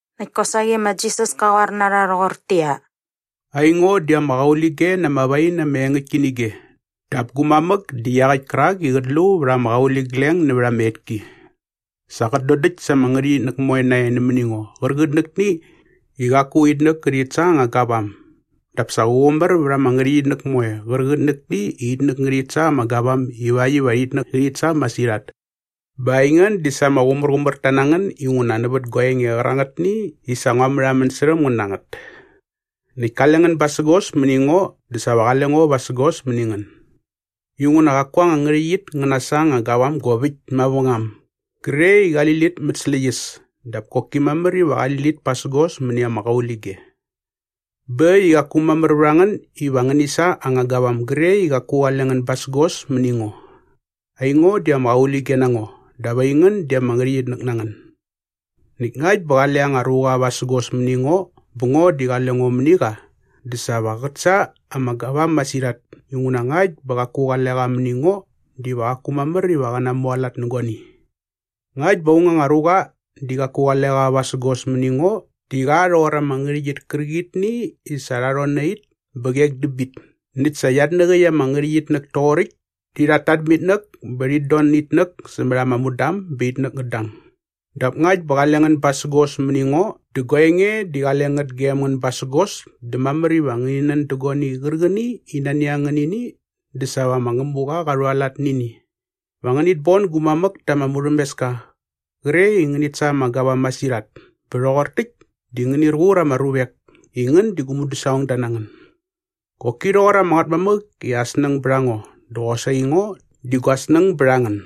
Näkt kosaqi ma Jisas ka qoar na rha rhoqortäqyia, “Aingo di ama qaulige na ama wain ama engäktki nä ige dap gu mamäk di iaqäkt kärak i qät lu vät ama qauligleng nävät ama etki. Sa qät dodäkt sa ama ngärhäqyitnäk moe nae nämäni ngo qärqitnäkni i qaku itnäk ngärhit sa anga gavam dap sa qä qumär vät ama ngärhäqyitnäk moe qärqitnäkni i itnäk ngärhit sa ama gavam ivakt iva itnäk ngärhit sa masirhat. Bä aingän di sa ama qumärqumärta na ngän inguna nävät gua enge qärangätni i sa ngua märhamän särhäm ngän na ngät. “Näkt kale ngän basägos mäni ngo dä sa va qale ngo vasägos mäni ngän. Inguna qaku anga ngärhäqyit ngä nasa anga gavam gop äkt mavängam gre i qali lit mät släqyäs dap koki mamär iva qali lit pasägos mäni ama qaulige. Bä äkt i qaku mamär vät a ngän iva ngäni sa anga gavam gre i qaku qale ngän basägos mäni ngo. Aingo di ama qaulige na ngo dap aingän di ama ngärhäqyitnäk na ngän. Näkt ngakt bä qale anga ruqa vasägos mäni ngo bä ngo di qale ngo mäni qa dä sa va qät sa ama gavam masirhat inguna ngakt bä qaku qale ngän mäni ngo diva qaku mamär iva ngä namualat nä guani. Ngakt bä aung anga ruqa di qaku qale qa vasägos mäni ngo di qa rhoqor ama ngärhäqyit kärqitni i sa rha rhon na it bä qek dä bit näkt sa iatnäqäkt ama ngärhäqyitnäk toqoräkt di rhat tat mä itnäk bä rhit don nä itnäk sämät ama mudam bä itnäk ngät dang. “Dap ngakt bä qale ngän basägos mäni ngo dä gua enge di qale ngät gem ngän basägos dä mamär iva ngäni nän da agini qärqäni i nani a ngän nä ini dä sa va ma Ngämuqa qa rhualat nä ini. Va ngänit bon gu mamäk ta ama murhämeska qre i ngänit sa ama gavam masirhat bä rhoqor täkt di ngänir qur ama ruvek i ngän di gu mudäsaqongda na ngän. Qoki rhoqor ama Ngätmamäk i aa snäng bät a ngo dä qosaqi ngo di gua snäng bät a ngän.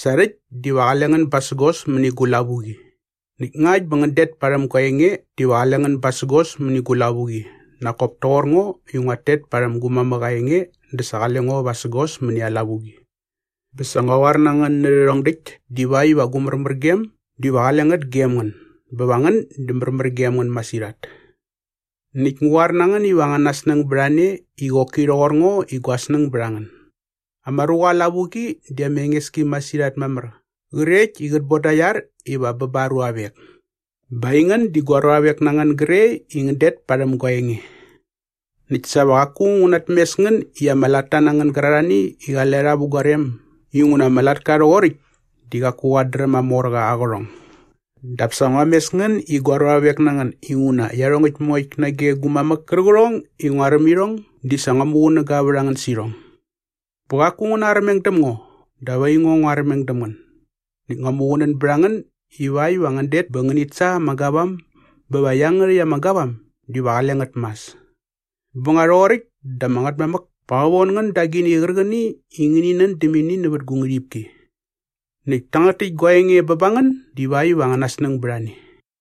Sa rhäkt diva qale ngän basägos mäni gu lavuqi. Näkt ngakt bä ngän det parhäm gua enge diva qale ngän basägos mäni gu lavuqi nak kop toqor ngo i nguat tet parhäm gu mamäk aa enge dä sa qale ngo vasägos mäni aa lavuqi. Bä sa ngua qoar na ngän nä rhärhong däkt divakt iva gu märmärgem diva qale ngät gem ngän bä va ngän di märmär gem ngän masirhat. “Näkt ngu qoar na ngän iva angäna snäng bät a ne i qoki rhoqor ngo i gua snäng bät a ngän. Ama ruqa aa lavuqi di ama enges ki masirhat mamär qrekt i qät boda aa iar iva bä ba aa ruavek. Bä aingän di gua ruavek na ngän gre i ngän det parhäm gua enge. “Näkt sa va qaku ngu natmes ngän i ama latta na ngän gärarhani i qale rha vä gua rem inguna ama latka rhoqoräkt di qaku qat dräm aa morqa aa qärhong. Dap sa ngua mes ngän i gua ruavek na ngän inguna iarhongäkt moekt nage gu mamäk kärqärhong i ngua räm irhong di sa ngua muqunäga vät a ngän sä irhong. Bä qaku ngän narmeng däm ngo dap aingo ngua armeng däm ngän näkt ngua muqunän bät a ngän ivakt iva ngän det bä ngänit sa ama gavam bä va iangärhäkt ama gavam diva qale ngät mas. Bä nga rhoqoräkt dä ama Ngätmamäk pa qä von ngän da agini qärqäni i ngäni nän däm ini nävät gu ngärhipki. Näkt tangät täk gua enge bä ba ngän divakt iva angäna snäng bät a ne.”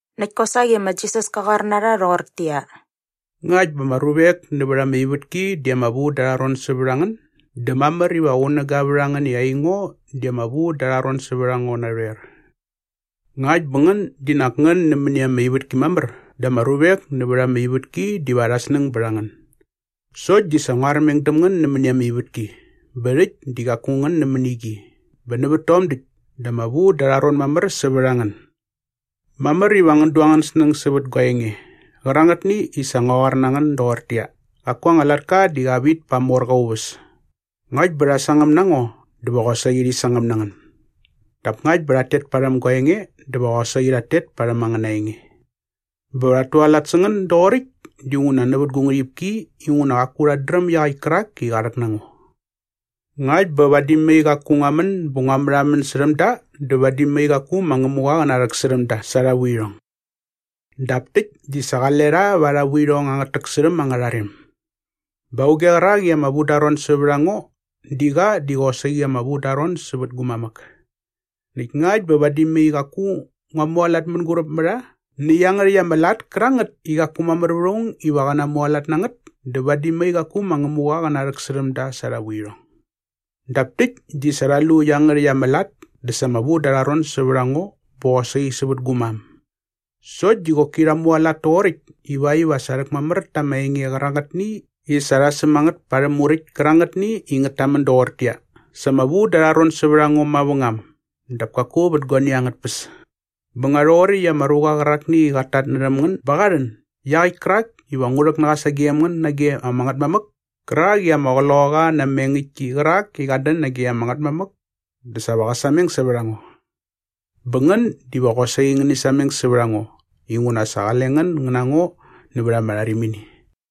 Näkt kosaqi ma Jisas ka qoar na rha rhoqortäqyia, “Ngakt bä ama ruvek nävät ama ivätki di ama vu da arha ron sävät a ngän dä mamär iva qunäga vät a ngän i aingo di ama vu da arha ron sävät a ngo narhoer. Ngakt bä ngän di nak nämäni ama ivätki mamär dä ama ruvek nävät ama ivätki diva arhä snäng bät a ngän. Sokt di sa ngua armeng däm ngän nämäni ama ivätki bä rhäkt di qaku ngän nämäni qi bä nävät tom däkt dä ama vu da arha ron mamär sävät a ngän. Mamär iva ngän du angän snäng sävät gua enge qärangätni i sa ngua qoar na ngän doqortäqyia, ‘Qaku anga latka di qa vit pa aa morqa aa uväs.’ Ngakt bä rha sangäm na ngo dä va qosaqi rhi sangäm na ngän. Dap ngakt bä rhat tet parhäm gua enge dä va qosaqi rhat tet parhäm angäna enge. “Bä va rhat tualat sä ngän doqoräkt dinguna nävät gu ngärhipki inguna qaku rhat dräm iaqäkt kärak i qa rhäk na ngo. Ngakt bä vadi mai qaku ngua män bä ngua märhamän särhäm da dä vadi mai qaku ma Ngämuqa qä narhäksärhäm da sa arha vuirhong. Dap täkt di sa qale rha va arha vuirhong angät täksärhäm angärha rem. “Bä auge qärak i ama vu da aa ron sävät a ngo di qa di qosaqi ama vu da aa ron sävät gu mamäk. Näkt ngakt bä vadi mai qaku ngua mualat mänguräp mä rha nä iangärhäkt ama lat kärangät i qaku mamär vät aung iva qä namualat nä ngät dä vadi mai qaku ma Ngämuqa qä narhäksärhäm da sa arha vuirhong. Dap täkt di sa rha lu iangärhäkt ama lat dä sa ama vu da arha ron sävät a ngo bä qosaqi sävät gu mam. Sokt di qoki rha mualat toqoräkt ivakt iva sa rhäkmamär ta ama enge qärangätni i sa rha säm a ngät pa arhä muräkt kärangätni i ngät tamän doqortäqyia, ‘Sa ama vu da arha ron sävät a ngo mavängam dap kaku vät guani angät tpäs.’ “Bä nga rhoqoräkt i ama ruqa qärakni i qat tatnärhäm ngän ba qa rhän iaqäkt kärak iva ngu rhäk na qa sagem ngän nage ama Ngätmamäk kärak i ama Qloqaqa na ama engäktki qärak i qat dän nage ama Ngätmamäk dä sa va qä sameng sävät a ngo. Bä ngän diva qosaqi ngäni sameng sävät a ngo inguna sa qale ngän ngän na ngo nävät ama rharimini.”